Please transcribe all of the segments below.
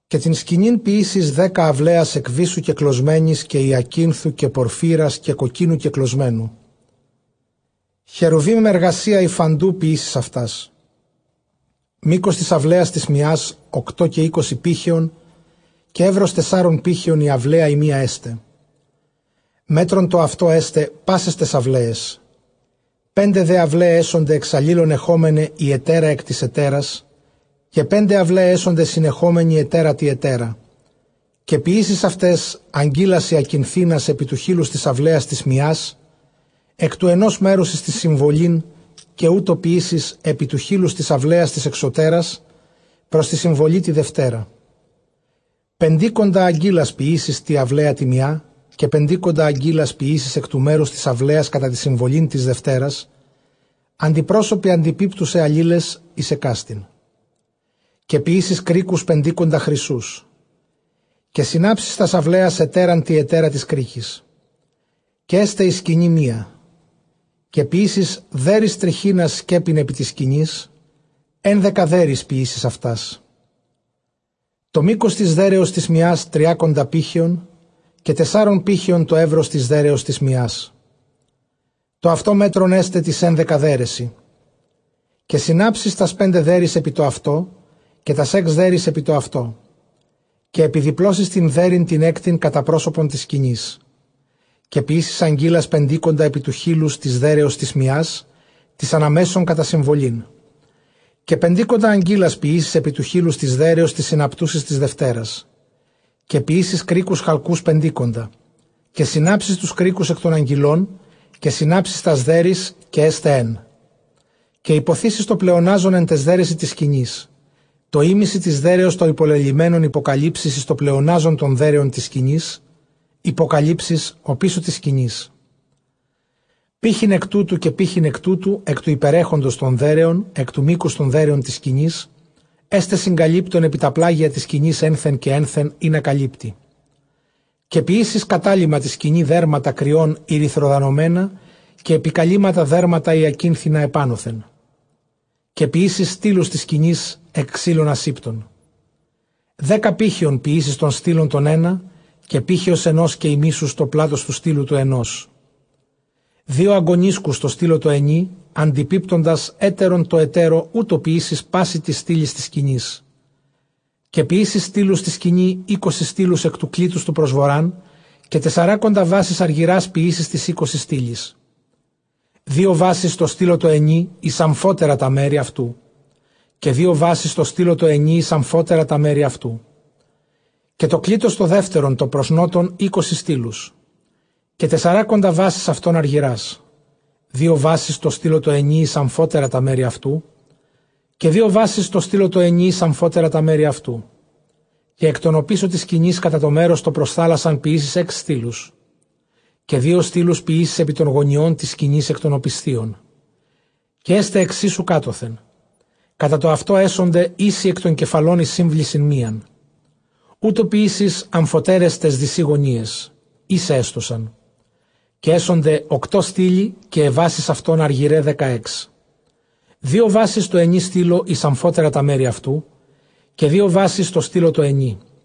Καὶ τὴν σκηνὴν ποιήσεις, δέκα αὐλαίας ἐκ βύσσου κεκλωσμένης, καὶ ὑακίνθου, καὶ πορφύρας, καὶ κοκκίνου κεκλωσμένου χερουβὶμ· ἐργασίᾳ ὑφάντου ποιήσεις αὐτάς. Μῆκος τῆς αὐλαίας τῆς μιᾶς ὀκτὼ καὶ εἴκοσι πήχεων, καὶ εὖρος τεσσάρων πήχεων ἡ αὐλαία ἡ μία ἔσται· μέτρον τὸ αὐτὸ ἔσται πάσαις ταῖς αὐλαίαις. Πέντε δὲ αὐλαῖαι ἔσονται ἐξ ἀλλήλων ἐχόμεναι ἡ ἑτέρα ἐκ τῆς ἑτέρας· καὶ πέντε αὐλαῖαι ἔσονται συνεχόμεναι ἑτέρα τῇ ἑτέρᾳ. Καὶ ποιήσεις αὐταῖς ἀγκύλας ὑακινθίνας ἐπὶ τοῦ χείλους τῆς αὐλαίας τῆς μιᾶς, ἐκ τοῦ ἑνὸς μέρους εἰς τὴν συμβολήν· καὶ οὕτω ποιήσεις ἐπὶ τοῦ χείλους τῆς αὐλαίας τῆς ἐξωτέρας πρὸς τῇ συμβολῇ τῇ δευτέρᾳ. Πεντήκοντα ἀγκύλας ποιήσεις τῇ αὐλαίᾳ τῇ μιᾷ, καὶ πεντήκοντα ἀγκύλας ποιήσεις ἐκ τοῦ μέρους τῆς αὐλαίας κατὰ τὴν συμβολὴν τῆς δευτέρας, ἀντιπρόσωποι ἀντιπίπτουσαι ἀλλήλαις εἰς ἑκάστην. Καὶ ποιήσεις κρίκους πεντήκοντα χρυσοῦς· καὶ συνάψεις τὰς αὐλαίας ἑτέραν τῇ ἑτέρα τοῖς κρίκοις· καὶ ἔσται ἡ σκηνὴ μία. Καὶ ποιήσεις δέῤῥεις τριχίνας σκέπην ἐπὶ τῆς σκηνῆς, ἕνδεκα δέῤῥεις ποιήσεις αὐτάς. Τὸ μῆκος τῆς δέῤῥεως τῆς μιᾶς, τριάκοντα πήχεων, καὶ τεσσάρων πήχεων τὸ εὖρος τῆς δέῤῥεως τῆς μιᾶς· τὸ αὐτὸ μέτρον ἔσται ταῖς ἕνδεκα δέῤῥεσι. Καὶ συνάψεις τὰς πέντε δέῤῥεις ἐπὶ τὸ αὐτὸ, καὶ τὰς ἓξ δέῤῥεις ἐπὶ τὸ αὐτό· καὶ ἐπιδιπλώσεις τὴν δέῤῥιν τὴν ἕκτην κατὰ πρόσωπον τῆς σκηνῆς. Καὶ ποιήσεις ἀγκύλας πεντήκοντα ἐπὶ τοῦ χείλους τῆς δέῤῥεως τῆς μιᾶς, τῆς ἀναμέσον κατὰ συμβολήν· καὶ πεντήκοντα ἀγκύλας ποιήσεις ἐπὶ τοῦ χείλους τῆς δέῤῥεως, τῆς συναπτούσης τῆς δευτέρας. Καὶ ποιήσεις κρίκους χαλκοῦς πεντήκοντα· καὶ συνάψεις τοὺς κρίκους ἐκ τῶν ἀγκυλῶν, καὶ συνάψεις τὰς δέῤῥεις, καὶ ἔσται ἕν. Καὶ ὑποθήσεις τὸ πλεονάζον ἐν ταῖς δέῤῥεσι τῆς σκηνῆς· τὸ ἥμισυ τῆς δέῤῥεως τὸ ὑπολελειμμένον ὑποκαλύψεις εἰς τὸ πλεονάζον τῶν δέῤῥεων τῆς σκηνῆς, ὑποκαλύψεις ὀπίσω τῆς σκηνῆς. Πῆχυν ἐκ τούτου, καὶ πῆχυν ἐκ τούτου, ἐκ τοῦ ὑπερέχοντος τῶν δέῤῥεων, ἐκ τοῦ μήκους τῶν δέῤῥεων τῆς σκηνῆς· ἔσται συγκαλύπτον ἐπὶ τὰ πλάγια τῆς σκηνῆς ἔνθεν καὶ ἔνθεν, ἵνα καλύπτῃ. Καὶ ποιήσεις κατακάλυμμα τῇ σκηνῇ δέρματα κριῶν ἠρυθροδανωμένα, καὶ ἐπικαλύμματα δέρματα ὑακίνθινα ἐπάνωθεν. Καὶ ποιήσεις στύλους τῆς σκηνῆς ἐκ ξύλων ἀσήπτων. Δέκα πήχεων ποιήσεις τὸν στύλον τὸν ἕνα, καὶ πήχεως ἑνὸς καὶ ἡμίσους τὸ πλάτος τοῦ στύλου τοῦ ἑνός. Δύο ἀγκωνίσκους τῷ στύλῳ τῷ ἑνὶ, ἀντιπίπτοντας ἕτερον τῷ ἑτέρῳ· οὕτω ποιήσεις πᾶσι τοῖς στύλοις τῆς σκηνῆς. Καὶ ποιήσεις στύλους τῇ σκηνῇ, εἴκοσι στύλους ἐκ τοῦ κλίτους τοῦ πρὸς Βοῤῥᾶν. Καὶ τεσσαράκοντα βάσεις ἀργυρᾶς ποιήσεις τοῖς εἴκοσι στύλοις· δύο βάσεις τῷ στύλῳ τῷ ἑνὶ εἰς ἀμφότερα τὰ μέρη αὐτοῦ· και δύο βάσεις τῷ στύλῳ τῷ ἑνὶ εἰς ἀμφοτέρα τὰ μέρη αὐτοῦ. Καὶ τὸ κλίτος τὸ δεύτερον τὸ πρὸς Νότον, εἴκοσι στύλους, καὶ τεσσαράκοντα βάσεις αὐτῶν ἀργυρᾶς· δύο βάσεις τῷ στύλῳ τῷ ἑνὶ εἰς ἀμφότερα τὰ μέρη αὐτοῦ, καὶ δύο βάσεις τῷ στύλῳ τῷ ἑνὶ εἰς ἀμφότερα τὰ μέρη αὐτοῦ. Καὶ ἐκ τῶν ὀπίσω τῆς σκηνῆς κατὰ τὸ μέρος τὸ πρὸς θάλασσαν ποιήσεις ἓξ στύλους. Καὶ δύο στύλους ποιήσεις ἐπὶ τῶν γωνιῶν τῆς σκηνῆς ἐκ τῶν ὀπισθίων. Καὶ ἔσται ἐξ ἴσου κάτωθεν· κατὰ τὸ αὐτὸ ἔσονται ἴσοι ἐκ τῶν κεφαλῶν εἰς σύμβλησιν μίαν· οὕτω ποιήσεῖς ἀμφοτέραις ταῖς δυσὶ γωνίαις· ἴσαι ἔστωσαν. Καὶ ἔσονται ὀκτὼ στύλοι, καὶ αἱ βάσεις αὐτῶν ἀργυραῖ δεκαέξ· δύο βάσεις τῷ ἑνὶ στύλῳ εἰς ἀμφότερα τὰ μέρη αὐτοῦ, καὶ δύο βάσεις τῷ στύλῳ τῷ ἑνί.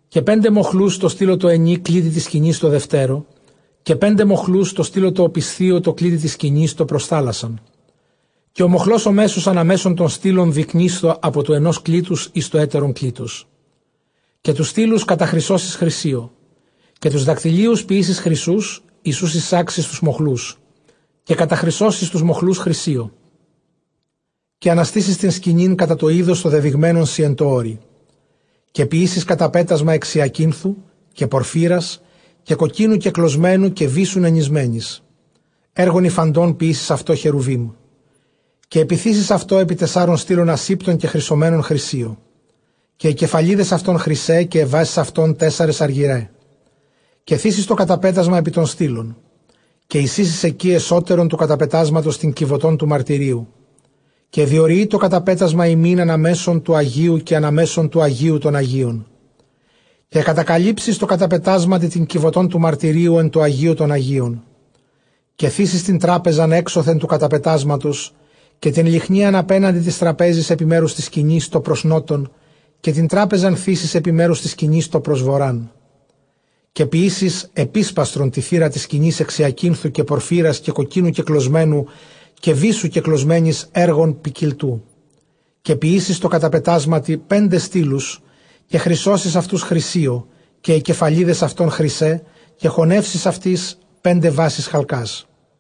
καὶ πέντε μοχλοὺς τῷ στύλῳ τῷ ἑνὶ κλίτει τῆς σκηνῆς τῷ δευτέρῳ, καὶ πέντε μοχλοὺς τῷ στύλῳ τῷ ὀπισθίῳ τῷ κλίτει τῆς σκηνῆς τῷ πρὸς θάλασσαν. Καὶ ὁ μοχλὸς ὁ μέσος ἀναμέσον τῶν στύλων διϊκνείσθω ἀπὸ τοῦ ἑνὸς κλίτους εἰς τὸ ἕτερον κλίτος. Καὶ τοὺς στύλους καταχρυσώσεις χρυσίῳ· καὶ τοὺς δακτυλίους ποιήσεις χρυσοῦς, εἰς οὓς εἰσάξεις τούς μοχλούς· καὶ καταχρυσώσεις τοὺς μοχλοὺς χρυσίῳ. Καὶ ἀναστήσεις τὴν σκηνὴν κατὰ τὸ εἶδος τὸ δεδειγμένον σοι ἐν τῷ ὄρει. Καὶ ποιήσεις καταπέτασμα ἐξ ὑακίνθου, καὶ πορφύρας, καὶ κοκκίνου κεκλωσμένου, καὶ βύσσου νενησμένης· ἔργον ὑφαντὸν ποιήσεις αὐτὸ χερουβίμ. Καὶ ἐπιθήσεις αὐτὸ ἐπὶ τεσσάρων στύλων ἀσήπτων κεχρυσωμένων χρυσίῳ· καὶ αἱ κεφαλίδες αὐτῶν χρυσαῖ, καὶ αἱ βάσεις αὐτῶν τέσσαρες ἀργυραῖ. Καὶ θήσεις τὸ καταπέτασμα ἐπὶ τῶν στύλων· καὶ εἰσοίσεις ἐκεῖ ἐσώτερον τοῦ καταπετάσματος τὴν κιβωτὸν τοῦ μαρτυρίου· καὶ διοριεῖ τὸ καταπέτασμα ὑμῖν ἀναμέσον τοῦ ἁγίου καὶ ἀναμέσον τοῦ ἁγίου τῶν ἁγίων. Καὶ κατακαλύψεις τῷ καταπετάσματι τὴν κιβωτὸν τοῦ μαρτυρίου ἐν τῷ ἁγίῳ τῶν ἁγίων. Καὶ ἐπιθήσεις τὴν τράπεζαν ἔξωθεν τοῦ καταπετάσματος, καὶ τὴν λυχνίαν ἀπέναντι τῆς τραπέζης ἐπὶ μέρους τῆς σκηνῆς τὸ πρὸς Νότον· καὶ τὴν τράπεζαν θήσεις ἐπὶ μέρους τῆς σκηνῆς τὸ πρὸς Βοῤῥᾶν. Καὶ ποιήσεις ἐπίσπαστρον τῇ θύρᾳ τῆς σκηνῆς ἐξ ὑακίνθου, καὶ πορφύρας, καὶ κοκκίνου κεκλωσμένου, καὶ βύσσου κεκλωσμένης, ἔργον ποικιλτοῦ. Καὶ ποιήσεις τῷ καταπετάσματι πέντε στύλους, καὶ χρυσώσεις αὐτοὺς χρυσίῳ· καὶ αἱ κεφαλίδες αὐτῶν χρυσαῖ· καὶ χωνεύσεις αὐτοῖς πέντε βάσεις χαλκᾶς.